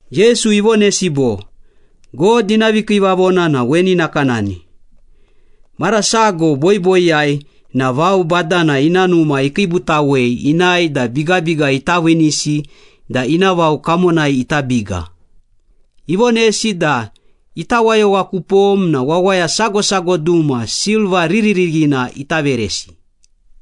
Yesu ivonesi bo, “God ina vikiivavona na weni nakanani. Mara sago boiboiyai na vao badana ina numa ikiibutawei inae da bigabiga ita viinisi da ina vao kamonai ita biga. Ivonesi da ita wayowa kupom na wawaya sago sago duma silva riririghina.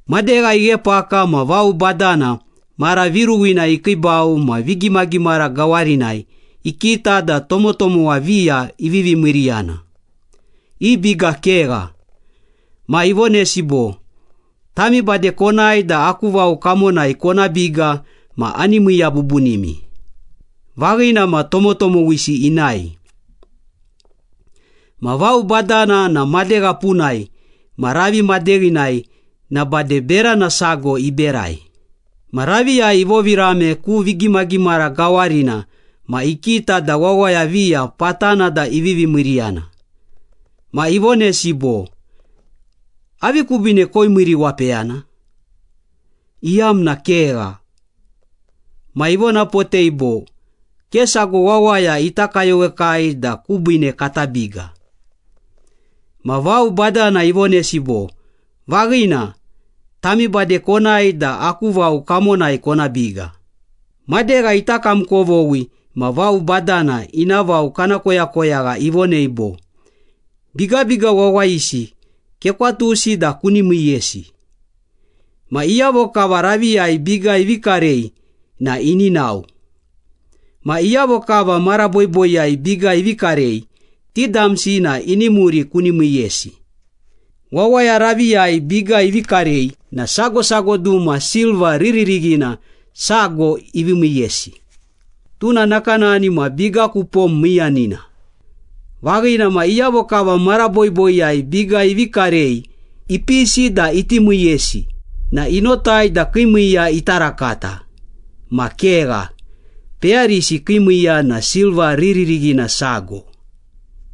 “Madegha ighepaka ma vao badana mara viruwina ikiibau ma vigimagimara gawarinai ikita da tomotomowa viya ivivi miiriyana, i biga kegha. Ma ivonesi bo, ‘Tami bade konae da aku vao kamonai kona biga ma ani miiya bubunimi.’ Vaghina ma, tomotomowisi inae.” “Ma vao badana na madegha punai ma ravi madeghinai na bade berana sago iberai. Ma raviyai ivovirame ku vigimagimara gawarina ma ikita da wawaya viya patana da ivivi miiriyana. Ma ivonesi bo, ‘Avi kubiine koimiiriwapeyana? Iyamna kegha.’” “Ma ivonapotei bo, ‘Ke sago wawaya ita kayowekai da kubiine kata biga.’” “Ma vao badana ivonesi bo, ‘Vaghina, tami bade konae da aku vao kamonai kona biga.’” “Madegha ita kamkovoghi ma vao badana ina vao kana koyakoyagha ivonei bo, ‘Bigabiga wawayisi kekwatusi da kuni miiyesi. Ma iyavo kava raviyai biga ivi karei na ini nao. Ma iyavo kava mara boiboiyai biga ivi karei, ti damsi na ini muri kuni miiyesi.’” “Wawaya raviyai biga ivi karei na sago sago duma silva riririghina sago ivi miiyesi, tuna nakanani ma biga ku pom miiyanina. Vaghina ma, iyavo kava mara boiboiyai biga ivi karei ipisi da iti miiyesi na inotai da kii miiya ita rakata. Ma kegha, peyarisi kii miiya na silva riririghina sago.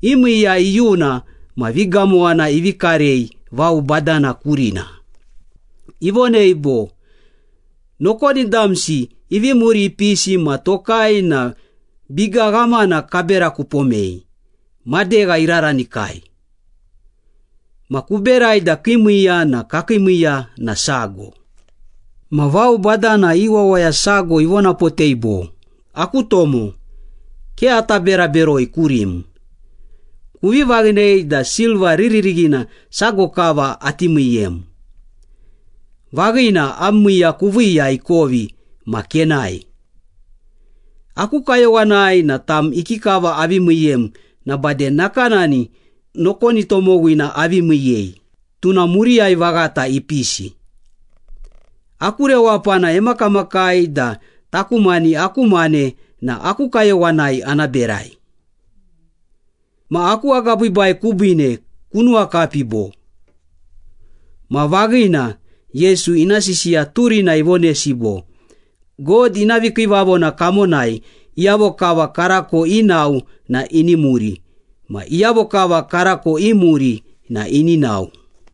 I miiya iyuna ma vigamowana ivi karei vao badana kurina. Ivonei bo, ‘Nokoni damsi ivi muri ipisi ma tokai na biga ghamana kabera kupomei, madegha iraranikai. Ma kuberai da kii miiya ma kakii miiya na sago.’” “Ma vao badana i wawaya sago ivonapotei bo, ‘Aku tomo, ke ata bera beroi kurim. Kuvi vaghinei da silva riririghina sago kava ati miiyem. Vaghina, am miiya kuviiya ikovi ma kenae. Aku kayowanai na tam ikikava avi miiyem na bade nakanani nokoni tomowina avi miiyei, tuna muriyai vaghata ipisi. Aku rewapana emakamakai da taku mani aku mane na aku kayowanai ana berai. Ma aku agabiibai kubiine kunuwakapi bo?’” Ma vaghina, Yesu ina sisiya turina ivonesi bo, “God ina vikiivavona kamonai iyavo kava karako inao na ini muri ma iyavo kava karako imuri na ini nao.”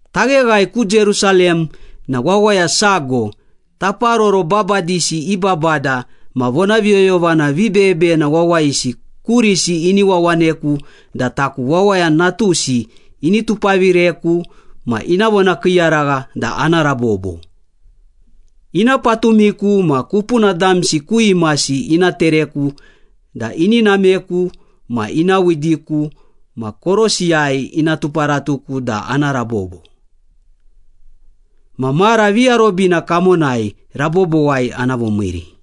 “Tagheghae ku Jerusalem na wawaya sago, taparoro babadisi i babada ma vonaviyoyovana vibeyebeyena wawayisi kurisi ini wawaneku da taku Wawaya Natusi, ini tupavireku ma ina vonakiiyaragha da ana rabobo. Ina patumiku ma kupuna damsi ku imasi ina tereku da ini nameku ma ina widiku ma korosiyai ina tuparatuku da ana rabobo. Ma mara viarobina kamonai rabobowai ana vomiiri.”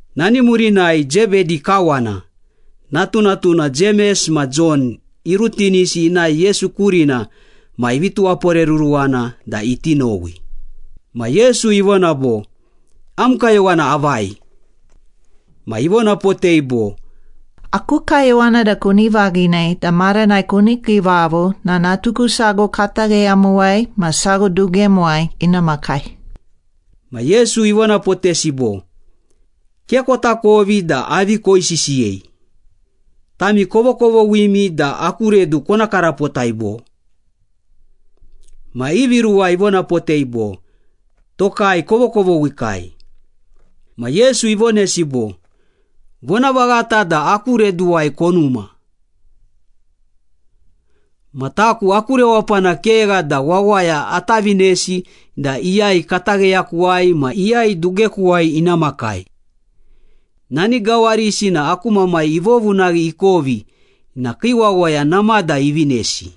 Nani murinai Zebedi kawana, natunatuna Jemes ma Jon irutinisi inae Yesu kurina ma ivi tuwaporeruruwana da iti nowi. Ma Yesu ivona bo, “Am kayowana avai?” Ma ivonapotei bo, “Aku kayowana da kuni vaghinei da maranai kuni kiivavo na natuku sago katagheyamuwai ma sago dugemuwai ina makai.” Ma Yesu ivonapotesi bo, “Ke kotakovi da avi koisisiyei. Tami kovokovoghimi da aku redu kona karapotai, bo?” Ma ivi ruwa ivonapotei bo, “Tokai kovokovoghikai.” Ma Yesu ivonesi bo, “Vonavaghata da aku reduwai konuma. Ma taku aku rewapana kegha da wawaya ata vinesi da iyai katagheyakuwai ma iyai dugekuwai ina makai. Nani gawarisi na aku Mamai ivovunaghi ikovi na kii wawaya namada ivinesi.”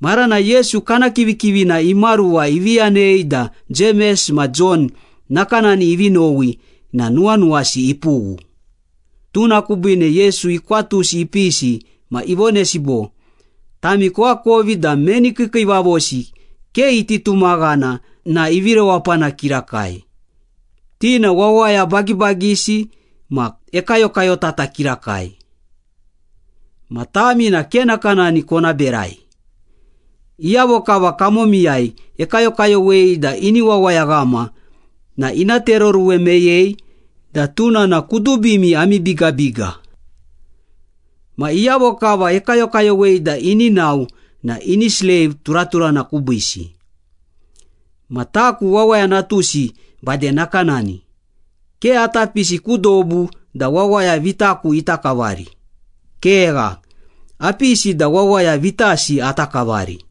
Maranai Yesu kana kivikivina imaruwa ivi yanei da Jemes ma Jon nakanani ivi nowi na nuwanuwasi ipughu. Tuna kubiine Yesu ikwatusi ipisi ma ivonesi bo, “Tami koakovi da meni kiikiivavosi ke iti tumaghana na ivi rewapana kirakai, ti na wawaya bagibagisi ma ekayokayotata kirakai. Ma tami na ke nakanani kona berai. Iyavo kava kamomiyai ekayokayowei da ini wawayaghama na ina tereoruwe meyei da tuna na kudubimi ami bigabiga. Ma iyavo kava ekayokayowei da ini nao na ini sleiv turaturana kubiisi. Ma taku Wawaya Natusi bade nakanani, ke ata pisi ku dobu da wawaya vitaku ita kavari. Kegha, apisi da wawaya vitasi ata kavari.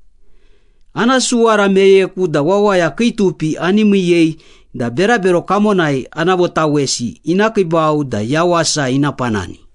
Ana suwara meyeku da wawaya kii tupi ani miiyei da berabero kamonai ana votawesi ina kiibau da yawasa ina panani.”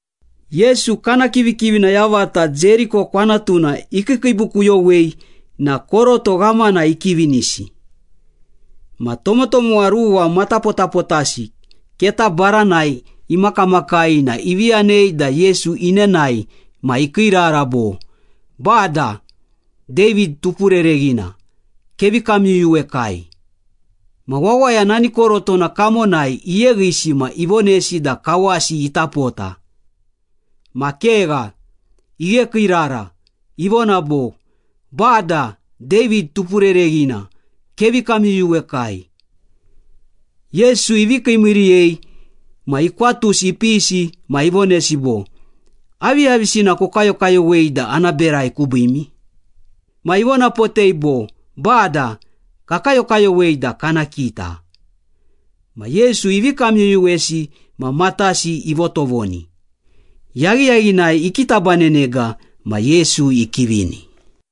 Yesu kana kivikivina yavata Jeriko kwanatuna ikiikiibukuyowei na koroto ghamana ikivinisi. Ma tomotomowa ruwa matapotapotasi keta baranai imakamakai na ivi yanei da Yesu inenae ma ikiirara bo, “Bada, David Tupurereghina, kevi kamyuyuwekai.” Ma wawaya nani korotona kamonai iyeghisi ma ivonesi da kawasi ita pota. Ma kegha, ighekiirara, ivona bo, “Bada, David Tupurereghina, kevi kamyuyuwekai.” Yesu ivi kiimiiriyei ma ikwatusi ipisi ma ivonesi bo, “Aviyavisina kokayokayowei da ana berai kubiimi?” Ma ivonapotei bo, “Bada, kakayokayowei da kana kita.” Ma Yesu ivi kamyuyuwesi ma matasi ivotovoni. Yaghiyaghinai ikitabanenega ma Yesu ikivini.